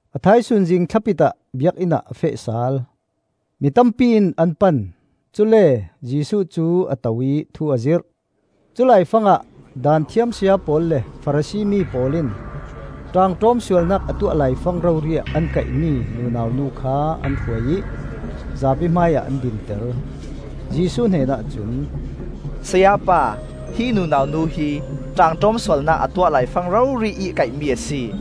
A thaisun zingthlapit ah Biakinn ah a feh sal. Mi tampi in an pan, cule Jesuh cu a to ih thu a zirh. Culai fangah Daanthiam saya pawl le Farasi mi pawl in ṭaangṭawm sualnak a tuah laifang rori an kaihmi nunau nu kha an hruai ih zapi hmaiah an dinter. Jesuh hnen ahcun, “Sayapa, hi nunau nu hi ṭaangṭawm sualnak a tuah laifang rori-ih kaihmi a si.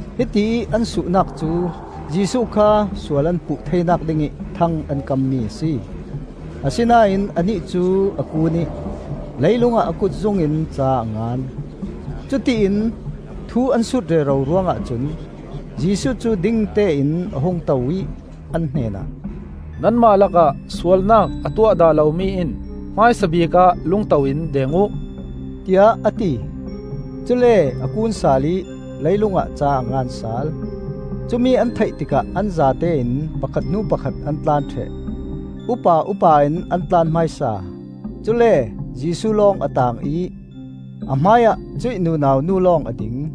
Hitiih an suhnak cu Jesuh kha sual an puh theinak dingih thang an kammi a si. Asinain anih cu a kun ih leilung ah a kutzung in ca a ngan. Cutiin thu an sut rero ruangah cun Jesuh cu dingtein a hung to ih an hnenah, “Nanmah lakah sualnak a tuah dah lomi in hmaisabik ah lungto in deng uh,” tiah a ti. Cule a kun sal ih leilung ah ca a ngan sal. Cumi an theih tikah an zatein pakhat hnu pakhat an tlan ṭheh: Upa upa in an tlan hmaisa. Cule Jesuh lawng a taang ih a hmaiah cuih nunau nu lawng a ding.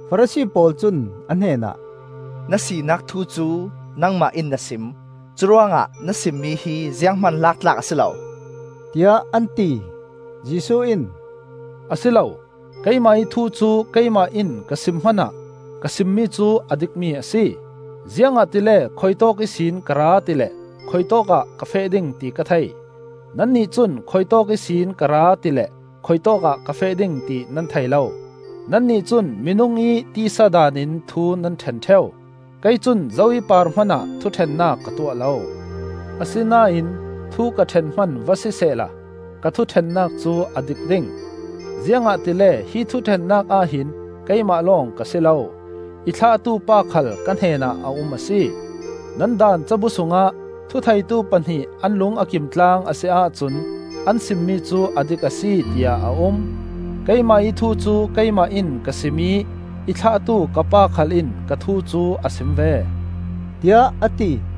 Farasi pawl cun a hnenah, “Na sinak thu cu nangmah in na sim. Curuangah na simmi hi zianghman lak tlak a si lo,” tiah an ti. Jesuh in, “A si lo; keimah ih thu cu keimah in ka sim hmanah ka simmi cu a dikmi a si, ziangahtile khuitawk ihsin ka ra ti le khuitawkah ka feh ding ti ka thei. Nannih cun khuitawk ihsin ka ra ti le khuitawkah ka feh ding ti nan thei lo. Nannih cun minung ih tisa daan in thu nan ṭhen ṭheu; kei cun zo ih par hmanah thuṭhennak ka tuah lo. Asinain thu ka ṭhen hman va sisehla ka thuṭhennak cu a dik ding, ziangahtile hi thuṭhennak ah hin keimah lawng ka si lo, i thlahtu pa khal ka hnenah a um a si. Nan Daan cabu sungah ‘Thu theitu pahnih an lung a kimtlang a si ahcun an simmi cu a dik a si,’ tiah a um. Keimah ih thu cu keimah in ka sim ih i thlahtu ka Pa khal in ka thu cu a sim ve,” tiah a ti.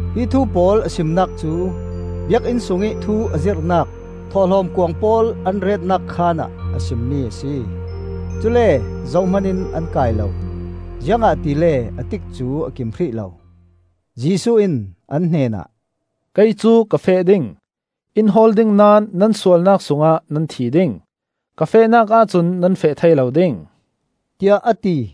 Hi thu pawl a simnak cu Biakinn sungih thu a zirhnak thawhlawm kuang pawl an retnak khaan ah a simmi a si. Cule zohman in an kai lo, ziangahtile a tikcu a kim hrih lo. Jesuh in an hnenah, “Kei cu ka feh ding; in hawl ding naón nan sualnak sungah nan thi ding. Ka fehnak ahcun nan feh thei lo ding,” tiah a ti.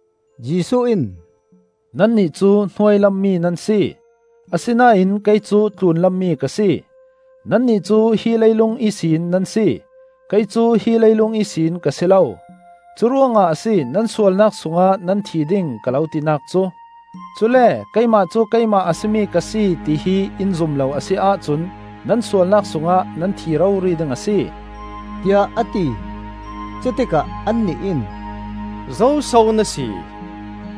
Jesuh in, “Nannih cu hnuailam mi nan si; asinain kei cu tlunlam mi ka si. Nannih cu hi leilung ihsin nan si, kei cu hi leilung ihsin ka si lo. Curuangah a si nan sualnak sungah nan thi ding, ka lo tinak cu! Cule ‘Keimah cu Keimah a si mi ka si,’ tihi in zum lo a si ahcun nan sualnak sungah nan thi rori ding a si,” tiah a ti. Cutikah annih in, “Zoso na si?”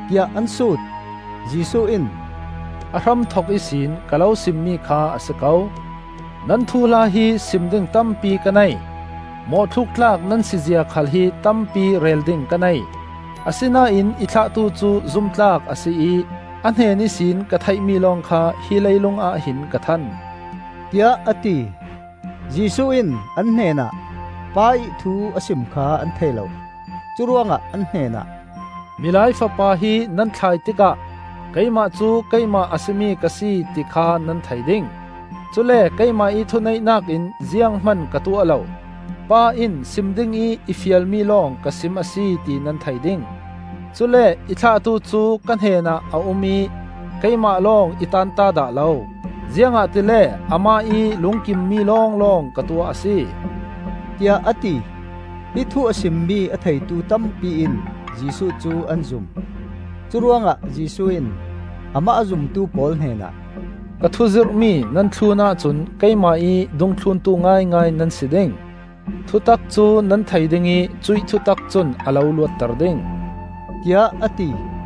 tiah an sut. Jesuh in, “A hramthok ihsin ka lo simmi kha a si ko. Nan thuhla hi sim ding tampi ka nei; mawhthluk tlak nan sizia khal hi tampi rel ding ka nei. Asinain i thlahtu cu zumtlak a si ih a hnen ihsin ka theihmi lawng kha hi leilungah hin ka than,” tiah a ti. Jesuh in an hnenah Pa ih thu a sim kha an thei lo. Curuangah an hnenah, “Milai Fapa hi nan thlai tikah ‘Keimah cu Keimah a si mi ka si,’ ti kha nan thei ding. Cule keimah ih thuneihnak in zianghman ka tuah lo; Pa in sim dingih i fialmi lawng ka sim a si ti nan thei ding. Cule i thlahtu cu ka hnenah a um ih keimah lawng i tanta dah lo; ziangahtile amah ih lungkimmi lawnglawng ka tuah a si,” tiah a ti. Hi thu a simmi a theitu tampi in Jesuh cu an zum. Curuangah Jesuh in amah a zumtu pawl hnenah, “Ka thu zirhmi nan thlun ahcun keimah ih dungthluntu ngaingai nan si ding; thutak cu nan thei dingih cuih thutak cun a lo luatter ding,” tiah a ti.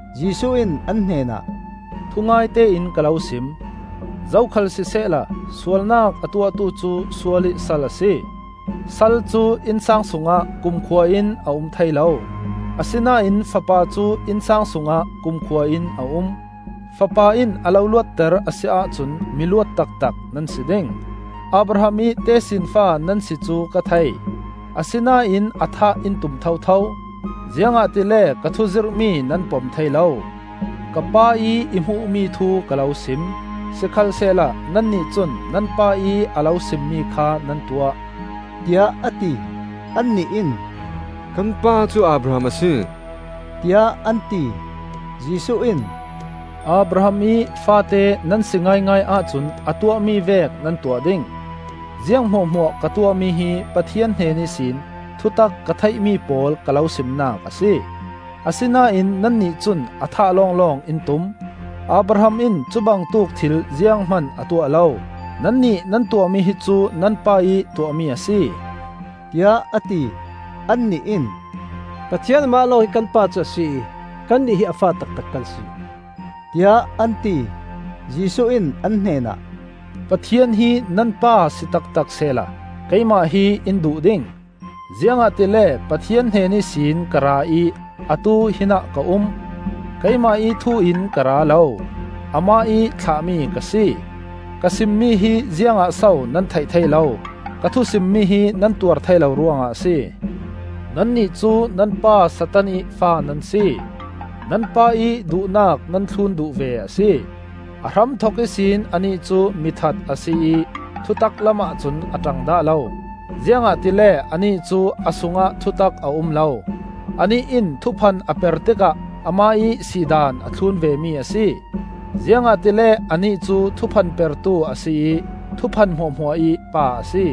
Jesuh in an hnenah, “Thungaite in ka lo sim: zokhal sisehla sualnak a tuahtu cu sualih sal a si. Sal cu innsang sungah kumkhua in a um thei lo; asinain fapa cu innsang sungah kumkhua in a um. Fapa in a lo luatter a si ahcun miluat taktak nan si ding. Abraham ih tesinfa nan si cu ka thei. Asinain a thah in tum thotho, ziangahtile ka thu zirhmi nan pom thei lo. Ka Pa ih i hmuhmi thu ka lo sim; sikhalsehla nannih cun nan pa ih a lo simmi kha nan tuah,” tiah a ti. Annih in, “Kan pa cu Abraham a si,” tiah an ti. Jesuh in “Abraham ih faate nan si ngaingai ahcun a tuahmi vek nan tuah ding. Ziang hmuahhmuah ka tuahmi hi Pathian hnen ihsin thutak ka theihmi pawl ka lo simnak a si; asinain nannih cun a thah lawnglawng in tum. Abraham in cubangtuk thil zianghman a tuah lo! Nannih nan tuahmi hi cu nan pa ih tuahmi a si,” tiah a ti. Annih in, “Pathian amah lawng hi kan Pa cu a si ih kannih hi a fa taktak kan si,” tiah an ti. Jesuh in an hnenah, “Pathian hi nan Pa si taktak sehla keimah hi in duh ding; ziangahtile Pathian hnen ihsin ka ra ih atu hinah ka um. Keimah ih thu in ka ra lo; amah ih thlahmi ka si. Ka simmi hi ziangah so nan theih thei lo? Ka thu simmi hi nan tuar thei lo ruangah a si. Nannih cu nan pa Satan ih fa nan si; nan pa ih duhnak nan thlun duh ve a si. A hramthok ihsin anih cu mithat a si ih thutak lam ahcun a ṭang dah lo, ziangahtile anih cu a sungah thutak a um lo. Anih in thuphan a per tikah amah ih si daan a thlun vemi a si, ziangahtile anih cu thuphan pertu a si ih thuphan hmuahhmuah ih pa a si.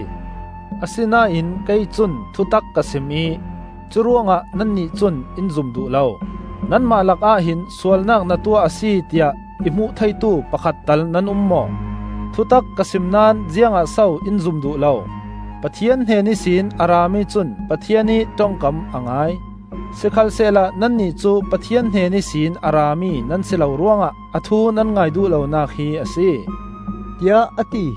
Asinain kei cun thutak ka sim ih curuangah nannih cun in zum duh lo. Nanmah lakah hin sualnak na tuah a si, tiah i hmuh theitu pakhat tal nan um maw? Thutak ka sim naón ziangah so in zum duh lo? Pathian hnen ihsin a rami cun Pathian ih ṭongkam a ngai. Sikhalsehla nannih cu Pathian hnen ihsin a rami nan si lo ruangah a thu nan ngai duh lonak hi a si,” tiah a ti.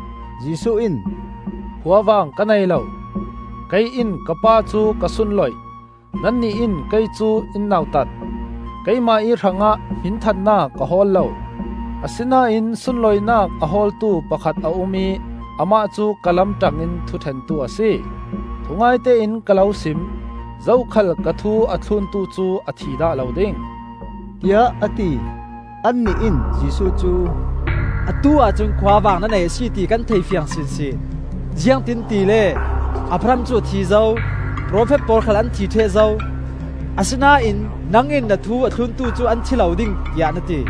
Jesuh in, “Khuavang ka nei lo; kei in ka Pa cu ka sunloih, nannih in kei cu in nautat. Keimah ih hrangah hminthannak ka hawl lo. Asinain sunlawinak a hawltu pakhat a um ih amah cu ka lam ṭangin thuṭhentu a si. Thungaite in ka lo sim: zokhal ka thu a thluntu cu a thi dah lo ding,” tiah a ti. Annih in Jesuh cu, “Atu-ah cun khuavang na nei a si, ti kan theifiang sinsin! Ziangtin tile Abraham cu a thi zo, profet pawl khal an thi ṭheh zo; asinain nang in na thu a thluntu cu an thi lo ding, tiah na ti.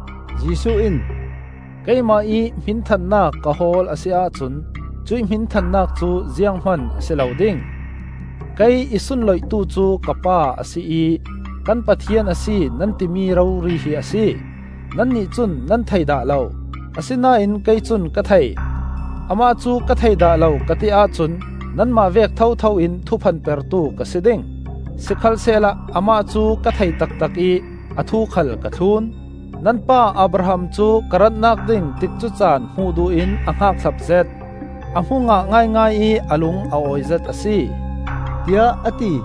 Jesuh in, “Keimah ih hminthannak ka hawl a si ahcun cuih hminthannak cu zianghman a si lo ding. Kei i sunloihtu cu ka Pa a si ih ‘Kan Pathian a si’ nan timi rori hi a si. Nannih cun nan thei dah lo; asinain kei cun ka thei. Amah cu ka thei dah lo ka ti ahcun nanmah vek thotho in thuphan pertu ka si ding. Sikhalsehla amah cu ka thei taktak ih a thu khal ka thlun. Nan pa Abraham cu ka ratnak ding tikcu caan hmuh duh in a hngakhlap zet; a hmu ngah ngaingai ih a lung a awi zet a si,” tiah a ti.